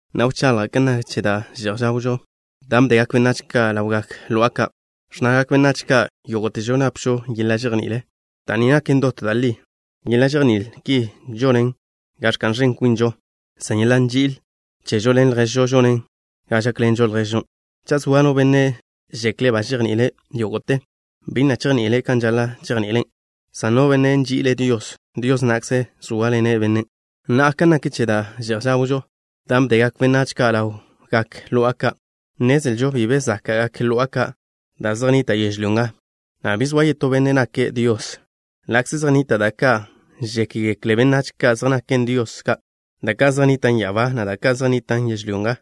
Na'a, wchaḻja' kan nak che da' že'j žawžo, dan' bdegak benách ka' ḻawgak lo'a ka'. Ẕnnagak benách ka': “Yógo'težo napžo yeḻa' žejní'il.” Da' ni naken dot da' ḻi. Yeḻa' žejní'il ki žonen ga ẕka'n ẕen kwinžo, san yeḻa' nži'il chežo ḻen lježžo žonen ga žákḻenžo lježžon'. Cha' zoa no benne' žekle' ba žejni'ile' yógo'te, bi na' chejni'ile' kan žaḻa' chejni'ile', san no benne' nži'ile' Dios, Dios na'kze zóaḻene' bennen'. Na'a, kan nak che da' že'j žawžo, dan' bdegak benách ka' ḻawgak lo'a ka', nnezlžo bi be záka'gak lo'a ka' da' zej nnitan' yežlyó nga, na' bi zoa yetó benne' nake' Dios. Ḻa'kze zej nnita' da' ka' žékgekle benách ka' zej naken dios ka', da' ka' zej nnitan' ya'abá, na' da' ka' zej nnitan' yežlyó nga,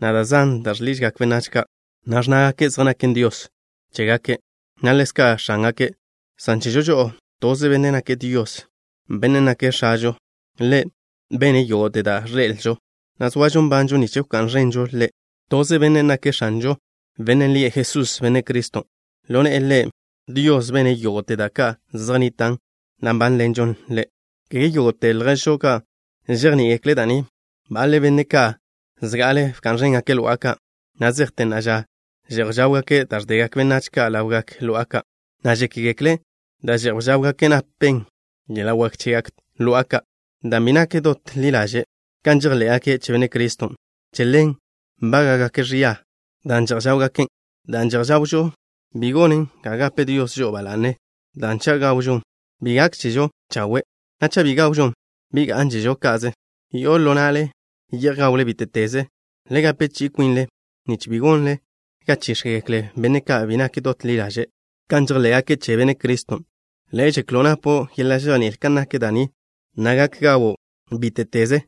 na' da' zan da' žḻižgak benách ka', na' ẕnnágake' zej naken dios chégake', na' ḻezka' x̱ángake', san chežo žo'o: Toze Benne' nake' Dios, Bennen' nake' X̱ažo. Ḻe' bene' yógo'te da' ẕḻe'elžo, na' zoažo nbanžo nich wká'n ẕenžo Ḻe'. Toze Benne' nake' X̱anžo, Bennen' lie' Jesús, Benne' Criston'. Ḻo ne'e Ḻe', Dios bene' yógo'te da' ka' zej nnitan', na' nbánḻenžo Ḻe'. Kege yógo'te lježžo ka' žejní'igekle' da' ni. Baḻe', benne' ka' zga'ale bka'n ẕéngake' lo'a ka', na' zejte na'a ža že'j žáwgake' da' ẕdegak benách ka' ḻawgak lo'a ka', na' žékgekle' da' že'j žáwgake' napen yeḻa' wak chegak lo'a ka'. Dan' bi nak dot ḻi ḻaže' kan žejḻé'gake' che Benne' Criston', che ḻen nbága'gake' ẕia dan' že'j žáwgaken'. Da' že'j žawžo bi gonen ga gape Dios žo'o ba la'ne, dan' cha' gawžon, bi gákžežo chawe', na' cha' bi gawžon, bi gá'nžežo ka'ze. Yo'o ḻo na'le ye'j gawle bíte'teze. Le gape chi'i kwinle nich bi gonle ga chíx̱gekle benne' ka' bi nak dot ḻi ḻaže' kan žejḻé'gake' che Benne' Criston'. Le' žeklo' napo' yeḻa' žejní'il kan nak da' ni, na' gak gawo' bíte'teze.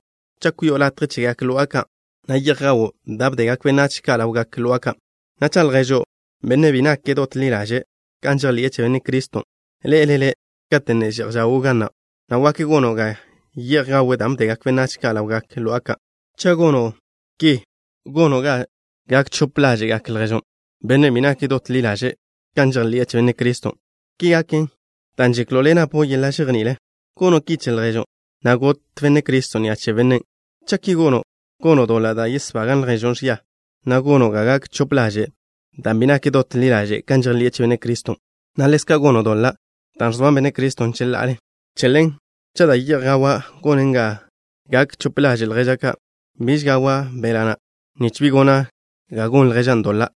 Cha' kwi'o latje chegak lo'a ka', na' ye'j gawo' da' bdegak benách ka' ḻawgak lo'a ka', na' cha' lježo', benne' bi nak dot ḻi ḻaže'e kan žejḻi'e che Benne' Criston', ḻe'ele' le', kate' ne že'j žawo' ga na', na' wak gono' ga ye'j gawe' dan' bdegak benách ka' ḻawgak lo'a ka'. Cha' gono' ki, gono' ga chix̱le lježo', bennen' bi nak dot ḻi ḻaže' kan žejḻi'e che Benne' Criston'. Ki gaken dan' žeklo' le' napo' yeḻa' žejní'il. ¿Gono' ki che lježo', na' got Benne' Criston' ni'a che bennen'? Cha' ki gono', gono' doḻa' da' yesbagan' lježo' ẕia, na' gono' ga chix̱le' dan' bi nak dot ḻi ḻaže' kan žejḻi'e che Benne' Criston', na' ḻezka' gono' doḻa' da' ẕzoan Benne' Criston' cheḻa'ale. Che ḻen, cha' da' ye'j gawa' gonen ga chix̱le to lježa', biž gawa' beḻa' na', nich bi gona' ga gon lježan' doḻa'.